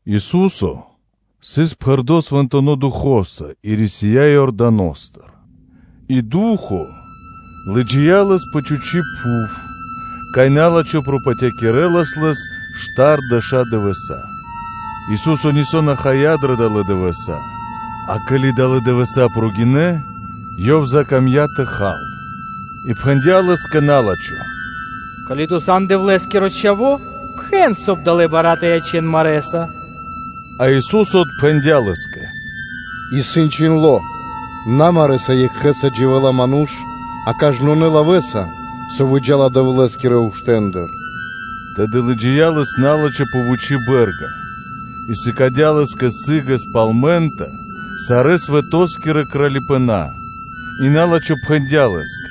Ису́со сыс пхэрдо́ Свэнтонэ́ Духо́са и рисия́ Иорданостыр и Ду́хо (Фа́но) лыджия́ Лэс пэ чхучи́ пхув, кай на́лачхо пропатякирэлас Лэс штардэша́ дывэса́ и Ису́со нисо́ на хая дрэ долэ́ дывэса́; а ке́ли далэ́ дывэса́ прогинэ́, Ёв закамдя́ тэ хал. И пхэндя́ Лэ́скэ на́лачхо: “Ко́ли Ту сан Дэвлэ́скиро Чхаво́, пхэн, соб (кай) далэ́ бара́ тэ ячэн марэ́са.” А Ису́со отпхэндя́ Лэ́скэ: “Исын чхиндло́: ‘На марэ́са екхэ́са дживэ́ла ману́ш, а кажнонэ́ лавэ́са, со выджа́ла Дэвлэ́скирэ уштэндыр.’” Тэды лыджия́ Лэс на́лачхо пэ вучи́ бэ́рга, и сыкадя́ Лэ́скэ сы́гэс пал мэнта (минута) сарэ́ свэто́скирэ кралипэна́. И на́лачхо пхэндя́ Лэ́скэ: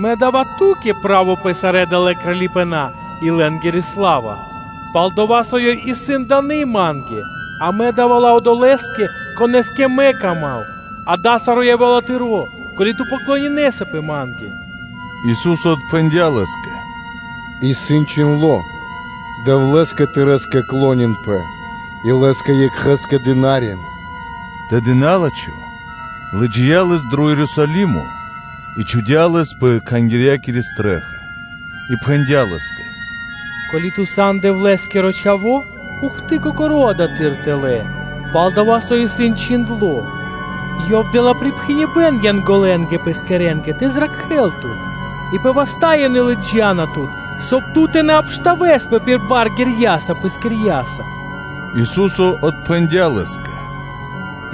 “Мэ да́ва Ту́кэ право пэ сарэ́ далэ́ кралипэна́, и лэ́нгири сла́ва, пал-дова́ со ёй исын дыны́ ма́нгэ, и мэ да́ва ла одолэ́скэ, конэ́скэ мэ кама́м; ґа́да, саро́ явэ́ла Тыро́, ко́ли Ту поклонинэсапэ ма́нгэ.” Ису́со отпхэндя́ Лэ́скэ: “Исын чхиндло́: ‘Дэвлэ́скэ тырэ́скэ клонинпэ и Лэ́скэ екхэ́скэ дынарин (служын)’” Тэды на́лачхо лыджия́ Лэс дро Ерусалимо, и чхудя́ Лэс пэ Кхангирья́кири стрэ́ха (чхаки́н), и пхэндя́ Лэ́скэ: “Ко́ли Ту сан Дэвлэ́скиро Чхаво́, ухты, Кокоро́, адатхы́р тэлэ́”, пал-дова́ со исын чхиндло́: “Ёв дэ́ла припхэныбэ́н Янголэнгэ Пэскирэнгэ тэ зракхэ́л Тут; и пэ васта́ ёнэ лыджа́на Тут, соб (кай) Ту тэ на обштавэспэ пир бар ґэрьяса Пэскирьяса.” Ису́со отпхэндя́ Лэ́скэ: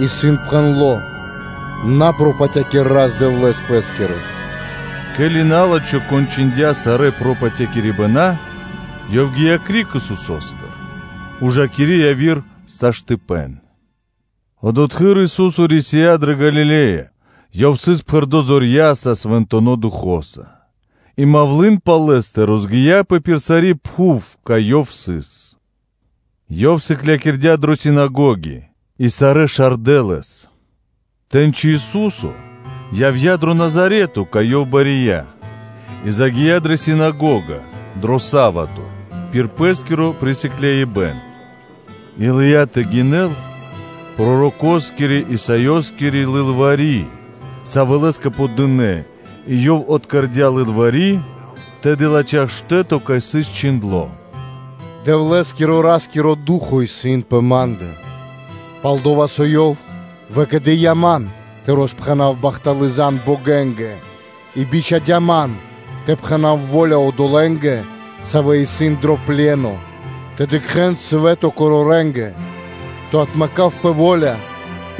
“Исын пхэндло́: ‘На пропатякир Рас-Дэвлэ́с пэ́скирэс.’” Ке́ли на́лачхо кончындя сарэ́ пропатякирибэна, ёв гия́ криг Исусо́стыр, ужакири яви́р часо. Одотхы́р Ису́со рисия́ дрэ Галиле́я. Ёв сыс пхэрдо́ Духо́са (Свэнтонэ́ Духо́са); и мавлы́н (малва) пал Лэ́стэ розгия́пэ пир сари́ пхув, кай Ёв сыс. Ёв сыклякирдя́ дрэ синагоги, и сарэ́ шардэ Лэс. Тэ́ньци Ису́со явдя́ дро Назарето, кай Ёв бария, и загия́ дрэ синагога дро са́вато (субо́та) пир Пэ́скиро присыкляибэн, и лыя́ тэ гинэл пророкоскирэ-Исаёскири лылвари́, сави́ Лэ́скэ подынэ; и Ёв откэрдя лылвари́, тэды латхя́ штэ́то, кай сыс чхиндло́: “Дэвлэ́скирэ–Ра́скиро Ду́хо (Фа́но) исын пэ ма́ндэ; пал-дова́ со Ёв выкэдыя́ Ман тэ роспхэнав бахталы́ зан (звесь) богэнгэ и бичхадя́ Ман тэ пхэна́в во́ля одолэ́нгэ, савэ́ исын дро пле́но, тэ дыкхэ́н свэ́то корорэнгэ; тэ отмэкав пэ во́ля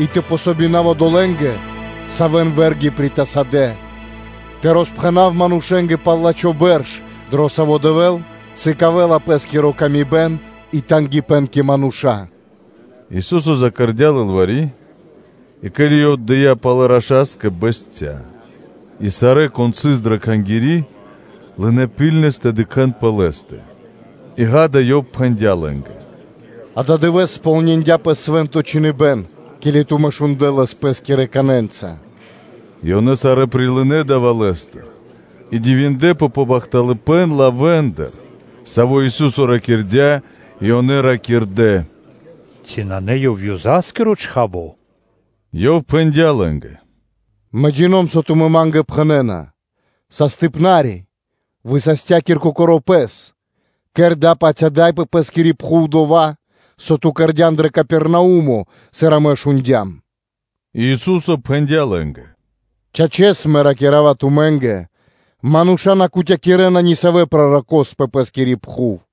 и тэ дзн васт одолэ́нгэ, савэ́н вэ́рги притасадэ, тэ роспхэнав манушэ́нгэ пал лачхо́ бэрш, дро саво́ Дэвэ́л сыкавэ́ла Пэ́скири ла́ска и тангипэ́н (жалима) кэ мануша́.” Ису́со закэрдя лылвари́, и ке́ли Ёв отдыя́ палэ раша́скэ, бэсця́; и сарэ́, кон сыс дрэ Кхангири́, лынэ́ ракхунэс тэ дыкхэ́н пэ Лэ́стэ, и ґа́да, Ёв пхэндя́ лэ́нгэ: “Ададывэ́с кэрдя́пэ кэ ко́нцо/яго́ро (сполниндяпэ) Свэ́нто Чхиныбэ́н, ке́ли тумэ́ шундлэ́ лэс пэ́скирэ канэнца.” И ёнэ сарэ́ прилынэ́ дава́ Лэ́стыр и дивиндэпэ пэ бахталыпэ́н лавэ́ндыр, савэ́ Ису́со ракирдя́ и ёнэ ракирдэ́: “Ци на Ёв исын Ёзаскиро Чхаво́?” Ёв пхэндя́ лэ́нгэ: “Мэ (джино́м) джина́в, со тумэ́ Ма́нгэ пхэнэ́на: ‘Састыпна́ре, высастякир Кокоро́ Пэс! Кэр дава́-паць ада́й, пэ Пэ́скири пхув дова́, со Ту кэрдя́н дро Капернаумо, сыр амэ шундя́м.’” И Ису́со пхэндя́ лэ́нгэ: “Чачэс, Мэ ракира́ва тумэ́нгэ: Мануша́ на кутякирэна ни савэ́ пророко́с пэ пэ́скири пхув,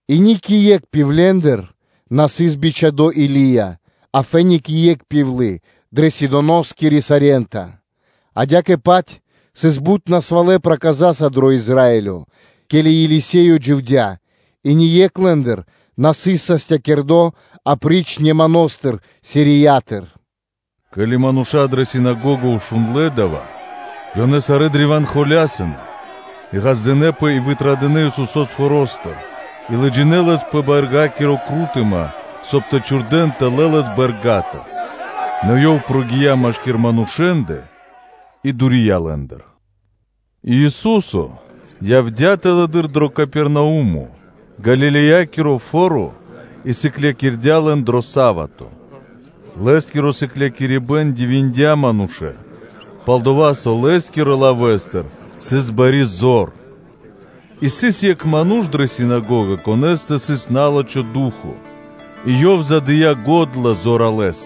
и ни кэ екх пивлендыр на сыс бичхадо́ Или́я, а кэ екх пивлы дрэ Сидоноскири Сарента; адя́кэ-паць, сыс бут насвалэ проказаза дро Израилё, ке́ли Елисеё дживдя́, и ни екх лэ́ндыр на высастия, апри́ч Нэманостэ Сириятыр.” Ке́ли мануша́ дрэ синагога шундлэ́ дава́, ёнэ сарэ́ древа́н холясынэ; и ґаздынэ́пэ и вытрадынэ́ Исусо́с форо́стыр, и лыджинэ́ Лэс пэ бэргакири крутыма, соб (кай) тэ чхурдэ́н тэлэ́ Лэс бэрга́тыр, нэ Ёв прогия́ машки́р манушэ́ндэ и дурия лэ́ндыр. И Ису́со явдя́ тэлэды́р дро Капернаумо, Галилеякиро фо́ро, и сыклякирдя́ лэн дро са́вато. Лэ́скиро сыклякирибэ́н дивиндя манушэ́н, пал-дова́ со Лэ́скирэ лавэ́стыр сыс бари зор. И сыс екх ману́ш дрэ синагога, конэ́стэ сыс на́лачхо ду́хо (фа́но), и ёв задыя го́дла зоралэ́с: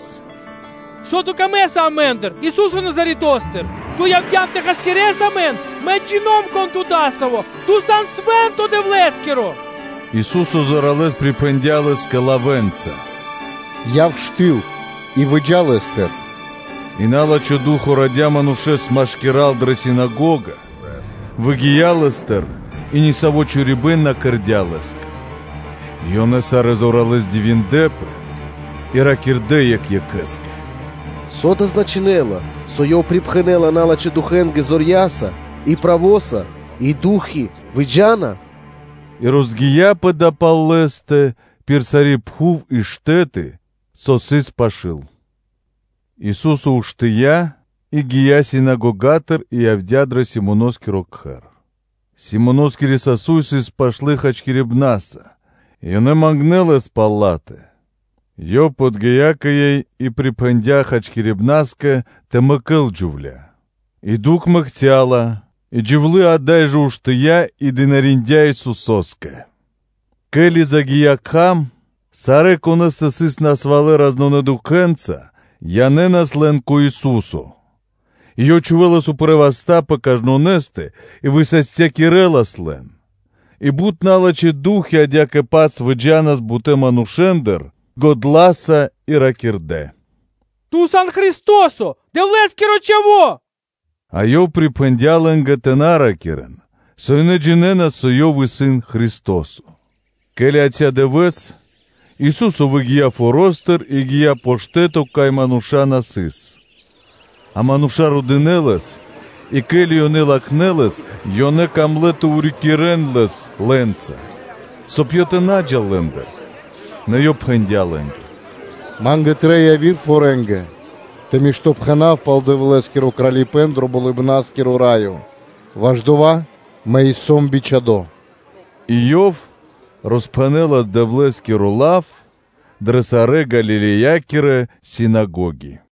“Со Ту камэ́са амэ́ндыр, Ису́се Назаретостыр? Ту явдя́н тэ хасякирэс амэн? Мы джина́в, кон Ту дасаво-Ту сан Свэ́нто Дэвлэ́скиро!” Ису́со зоралэ́с припхэндя́ Лэ́скэ лавэ́нца: “Яв штыл и выджа лэ́стыр.” И на́лачхо ду́хо (фа́но) радя манушэ́с машкира́л дрэ синагога, выгия́ лэ́стыр, и ни саво́ чорипэ́н на кэрдя́ Лэ́скэ. И ёнэ сарэ́ зоралэ́с дивиндлэ́пэ и ракирдэ́ екх екхэ́скэ: “Со дава́ значынэ́ла, со Ёв припхэнэла налачхэ́ духэнгэ зорья́са и правоса, и ду́хи (фаны) выджа́на?” И розгия́пэ мавлы́н (малва) пал Лэ́стэ пир сари́ пхув и штэ́ты, со сыс пашы́л. Ису́со уштыя́ и гия́ синагогатыр и явдя́ дро Симоноскиро кхэр; Симоноскири сасуй (тёшча) сыс пашты хачкирибнаса; и ёнэ мангнэ́ Лэс пал ла́тэ. Ёв подги́я кэ ёй и припхэндя́ хачкирибнаскэ тэ мэкэл джувля́; и дукх мэкця́ ла; и джувлы́ ада́й жэ уштыя́ и дынариндя́ Исусо́скэ. Ке́ли загия́ кхам, сарэ́, конэ́стэ сыс насвалэ разнонэ дукхэнца, янэ́нас лэн кэ Ису́со; и Ёв чхувэлас упрэ́ васта́ пэ кажнонэ́стэ, и высастякирэлас лэн; и бут налачхэ́ ду́хи адя́кэ-паць выджа́нас бутэ́ манушэ́ндыр годла́са и ракирдэ́: “Ту сан Христо́со, Дэвлэ́скиро Чхаво́.” А Ёв припхэндя́ лэ́нгэ тэ на ракирэ́н, со ёнэ джинэ́на, со Ёв исын Христо́со. Ке́ли яця́ дывэ́с, Ису́со выгия́ форо́стыр и гия́ пэ штэ́то, кай мануша́ на сыс, а мануша́ родынэ Лэс; и ке́ли ёнэ латхнэ́ Лэс, ёнэ камлэ́ тэ рикирэ́н Лэс, соб (кай) Ёв тэ на джал лэ́ндыр. Нэ Ёв пхэндя́ лэ́нгэ: “Ма́нгэ трэй и явирэ форьенгэ тэ миштопхэнав пал Дэвлэ́скиро Кралипэ́н, ваш дова́ Мэ и сом бичхадо́.” И Ёв роспхэнэлас Дэвлэ́скиро лав дрэ сарэ́ Галилеякирэ синагоги.